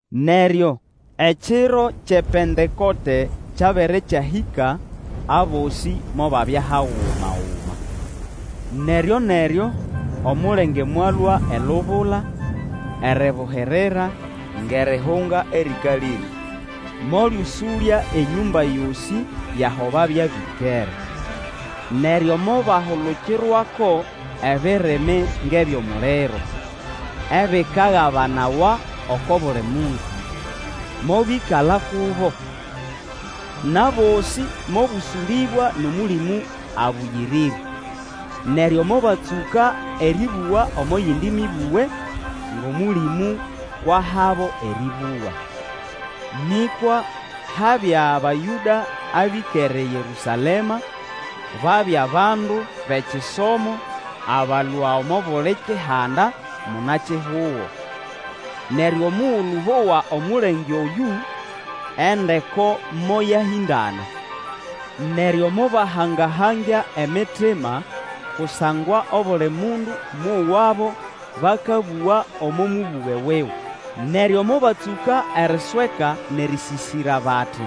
Neryo ekiro kyʼePentekote kyabere kyahĩka, abosĩ mobabya hagumaguma. Neryo-neryo omulenge mwalũa elubula eribuhirira ngʼerihunga erĩkalĩre, molyũsũlya enyũmba yosĩ yʼaho babya bĩkere. Neryo mobahulukirwako ebirimi ngʼebyʼomuliro, ebikagabanawa oko buli mundu, mobyĩkala kubo. Nʼabosĩ mobũsũlĩbwa nʼOmũlĩmũ Abũyĩrĩre, neryo mobatsũka erĩbũga omo yindi mĩbũge, ngʼOmũlĩmũ kwʼahabo erĩbũga. Nĩkwa habya Bayũda abĩkere eYerũsalema, babya bandu bʼekisomo abalũa omo buli kihanda muna-kihugo. Neryo omugulu bowa omulenge oyũ, endeko moyahĩndana. Neryo mobahanga-hangya emitima kusangwa obuli mundu mowabo bakabũga omo mũbũge wuwe. Neryo mobatsũka erisweka nʼerĩsĩsĩra bati,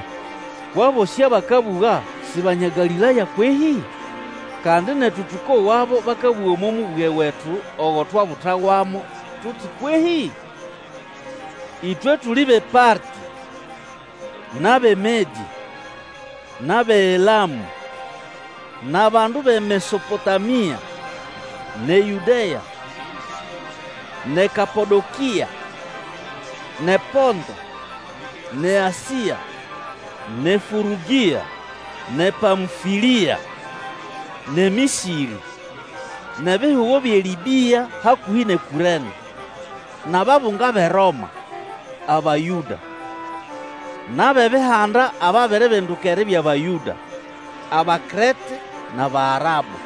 Kwʼabosĩ abakabũga si Banya Galĩlaya kwehĩ? Kandi netu tũkowabo bakabũga omo mũbũge wetu ogo twabutawamo tuti kwehĩ? Ĩtwe tuli bʼePartĩ, nʼabʼeMedĩ, nʼabʼeElamũ, nʼabandu bʼeMesopotamia, nʼeYũdea, nʼeKapodokĩa; nʼePonto, nʼeAsĩa, nʼeFũrũgĩa, nʼePamfĩlĩa, nʼeMĩsĩrĩ, nʼebihugo byʼeLĩbĩa hakũhĩ nʼeKũrene, nʼababunga bʼeRoma, Abayũda, nʼabʼebihanda ababiribinduka eribya Bayũda, Abakrete nʼAbaarabu.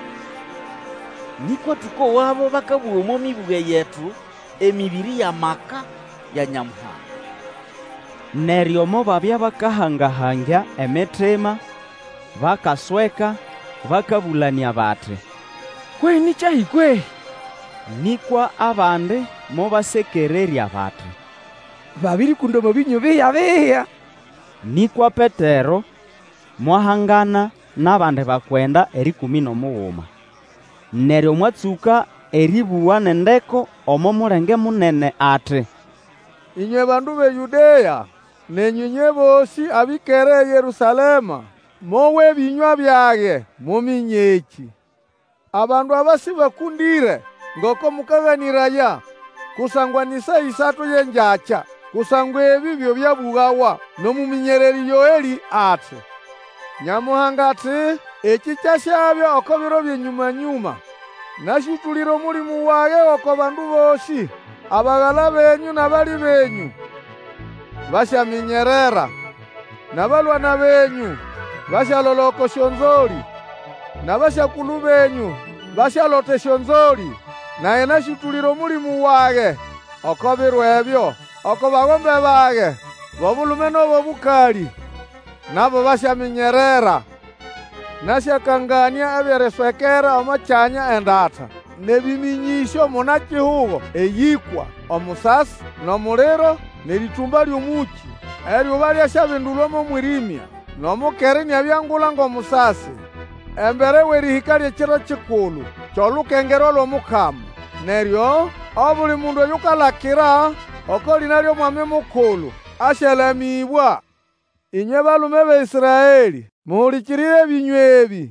Nĩkwa tũkowabo bakabũga omo mĩbũge yetu emĩbĩrĩ yʼamaka ya Nyamuhanga! Neryo mobabya bakahanga-hangya emitima, bakasweka, bakabũlanĩa bati, Kwe ni kyahi kwehĩ? Nĩkwa abandi mobasekererya bati, babĩrĩkũnda omo bĩnyũ bihya-bihya. Nĩkwa Petero mwahangana nʼabandi bakwenda erĩkũmĩ nʼomuguma, neryo mwatsũka erĩbũga nʼendeko omo mulenge munene ati, Ĩnywe bandu bʼeYũdea, nenyũ ĩnywe bosĩ abĩkere eYerũsalema, mowe ebĩnywa byage, muminye ekĩ. Abandu aba sĩbakũndĩre, ngoko mũkaganĩraya, kusangwa ni saa ĩsatu yʼengyakya. Kusangwa ebĩ byo byabũgawa nʼomũmĩnyererĩ Yoelĩ ati, Nyamuhanga ati, Ekĩ kyasyabya oko biro byʼenyũma-nyũma, Nasyũtũlĩra Omũlĩmũ wage oko bandu bosĩ; Abagala benyũ nʼabali benyũ basyaminyerera, Nʼabalwana benyũ basyalola oko syonzolĩ, Nʼabasyakulu benyũ basyalota esyonzolĩ. Nage nasyũtũlĩra Omũlĩmũ wage oko biro ebyo, Oko bagombe bage bʼobulume nʼabʼobũkalĩ, Nabo basyaminyerera. Nasyakanganĩa ebyʼeriswekera omo kyanya endata, Nʼebĩmĩnyĩsyo muna-kihugo eyĩkwa: Omusasi, nʼomuliro, nʼerĩtũmba lyʼomũkĩ. Eryuba lyasyabindulwa mo mwĩrĩmya, Nʼomukera iniabya ngula ngʼomusasi, Embere wʼerĩhĩka lyʼeKiro kikulu kyʼolukengerwa lʼOmukama. Neryo, obuli mundu oyukalakira oko lĩna lyʼOmwami Mukulu asyalamĩbwa. Ĩnywe, balume bʼeĨsraelĩ! muhulikirire ebĩnywa ebĩ!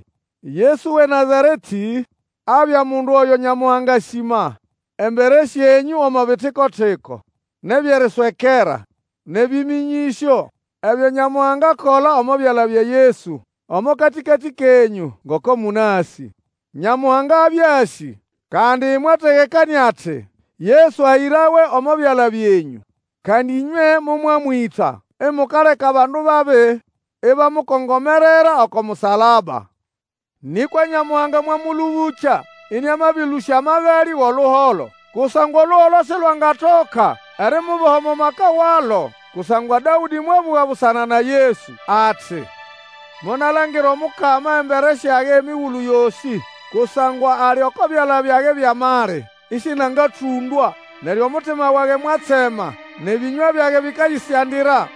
Yesu wʼeNazaretĩ, abya mundu oyo Nyamuhanga asĩma embere syenyũ omo bitiko-tiko, nʼebyʼeriswekera, nʼebĩmĩnyĩsyo ebyo Nyamuhanga akola omo byala bya Yesu omo katĩkatĩ kenyũ, ngoko mũnasĩ. Nyamuhanga abya asĩ, kandi mwategekanĩa ati, Yesu ahĩrawe omo byala byenyũ, kandi ĩnywe momwamwĩta, imukaleka abandu babi ibamukongomerera oko musalaba. Nĩkwa Nyamuhanga mwamũlũbũkya, ĩnĩamabĩlũsya amagalĩ wʼoluholo, kusangwa oluholo silwangatoka erimuboha omo maka walo. Kusangwa Dawĩdĩ mwabũga busana na Yesu ati, Monalangira Omukama embere syage emigulu yosĩ; Kusangwa ali oko byala byage byʼamali, ĩsĩnangatũndwa. Neryo omutima wage mwatsema, Nʼebĩnywa byage bĩkayĩsyandira,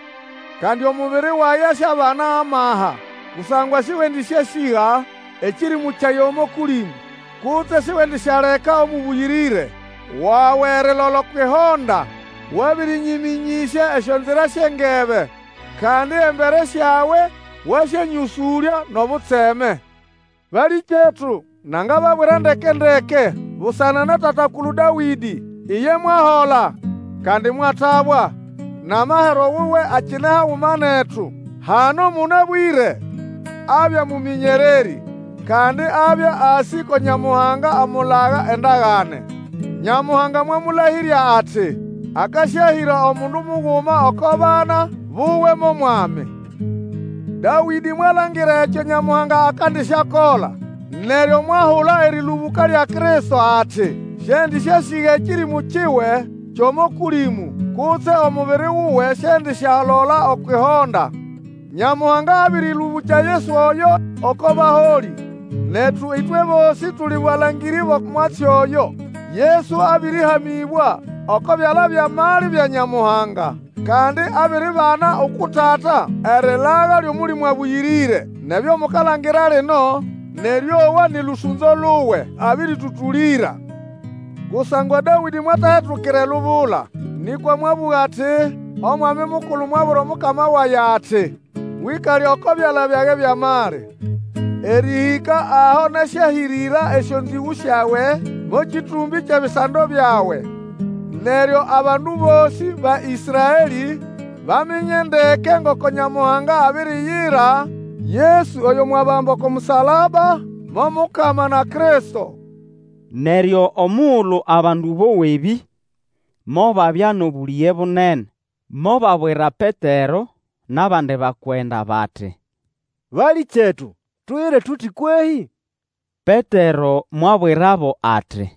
Kandi omubiri wage asyabana amaha, Kusangwa sĩwendĩsyasĩga ekĩrĩmũ kyage omo Kũlĩmũ, Kutse siwendisyaleka Omũbũyĩrĩre wawe erilola okwʼihonda. Wabĩrĩnyĩmĩnyĩsya esyonzira syʼengebe, Kandi embere syawe Wasyanyĩgũlya nʼobutseme. Balĩkyetu, nanga babwira ndekendeke busana na tata-kulu Dawĩdĩ. Iye mwahola kandi mwatabwa, nʼamahero wuwe akine haguma netu hano mũnabwĩre. Abya mũmĩnyererĩ, kandi abya asĩ ko Nyamuhanga amulaga endagane. Nyamuhanga mwamũlahĩrya ati akasyahĩra omundu muguma gʼoko bana buwe mo mwami. Dawĩdĩ mwalangira ekyo Nyamuhanga akandisyakola, neryo mwahula erĩlũbũka lya Kristo ati, Sĩendĩsyasĩga ekĩrĩmũ kiwe kyʼomo Kũlĩmũ, Kutse omubiri wuwe siendisyalola okwʼihonda. Nyamuhanga abĩrĩlũbũkya Yesu oyo oko baholĩ, netu ĩtwe bosĩ tuli balangĩrĩ bʼomwatsi oyo. Yesu abĩrĩhamĩbwa oko byala byʼamali bya Nyamuhanga, kandi abiribana uku Tata erilaga lyʼOmũlĩmũ Abũyĩrĩre, nʼebyo mukalangira lino nʼerĩowa nĩ lũsũnzo luwe abĩrĩtũtũlĩra. Kusangwa Dawĩdĩ mwatahetukira elubula, nĩkwa mwabũga ati, Omwami Mukulu mwabwira Omukama wage ati, Wĩkale oko byala byage byʼamali, Erĩhĩka aho nasyahĩrĩra esyonzĩgũ syawe, Mo kĩtũmbĩ kyʼebisando byawe. Neryo abandu bosĩ ba Ĩsraelĩ baminye ndeke ngoko Nyamuhanga abiriyira Yesu oyo mwabamba oko musalaba, mo Mukama na Kristo. Neryo omugulu abandu bowa ebĩ, mobabya nʼobũlĩge bunene, mobabwira Petero nʼabandi bakwenda bati, Balĩkyetu, tuyire tuti kwehĩ? Petero mwabwirabo ati,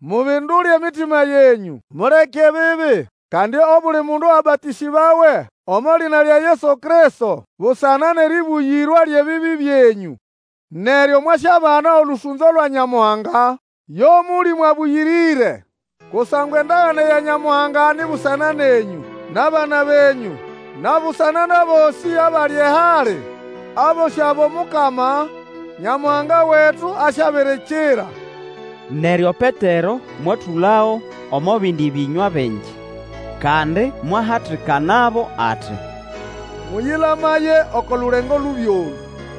Mubindule emitima yenyũ, muleke ebibi, kandi obuli mundu abatĩsĩbawe omo lĩna lya Yesu Kristo busana nʼeribuyirwa lyʼebibi byenyũ, neryo mwasyabana olũsũnzo lwa Nyamuhanga yo Mũlĩmũ Abũyĩrĩre. Kusangwa endagane ya Nyamuhanga ni busana nenyũ nʼabana benyũ na busana nʼabosĩ abali ehali, abosĩ abo Mukama Nyamuhanga wetu asyabirikira. Neryo Petero mwatũlago omo bindi bĩnywa bingi, kandi mwahatikanabo ati, Mũyĩlamaye oko lulengo lubi olũ!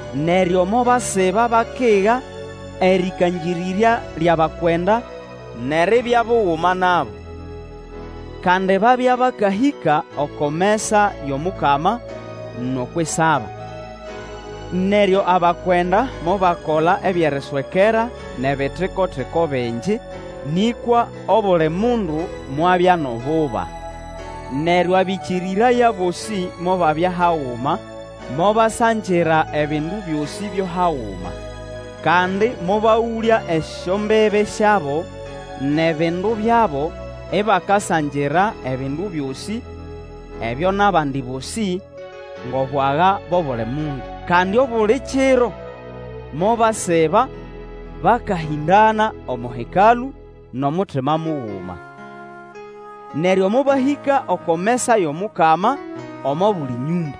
Neryo mobasiba bakiga erĩkangĩrĩrya lyʼabakwenda nʼeribya buguma nabo. Kandi babya bakahĩka oko mesa yʼomukama nʼokwʼisaba. Neryo abakwenda mobakola ebyʼeriswekera nʼebitiko-tiko bingi, nĩkwa obuli mundu mwabya nʼobuba. Neryo abĩkĩrĩraya bosĩ mobabya haguma, mobasangira ebindu byosĩ byo haguma. Kandi mobagũlya esyombibi syabo nʼebindu byabo, ibakasangira ebindu byosĩ ebyo nʼabandi bosĩ, ngʼobwaga bʼobuli mundu. Kandi obuli kiro mobasiba bakahĩndana omo Hekalũ nʼomutima muguma. Neryo mobahĩka oko mesa yʼomukama omo buli nyũmba,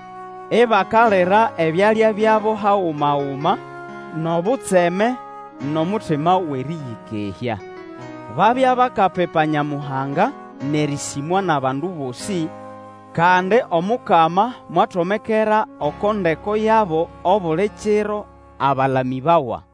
ibakalira ebyalya byabo haguma-guma, nʼobutseme nʼomutima wʼerĩyĩkehya. Babya bakapipa Nyamuhanga nʼerĩsĩmwa nʼabandu bosĩ. Kandi Omukama mwatomekera eko ndeko yabo obuli kiro abalamĩbawa.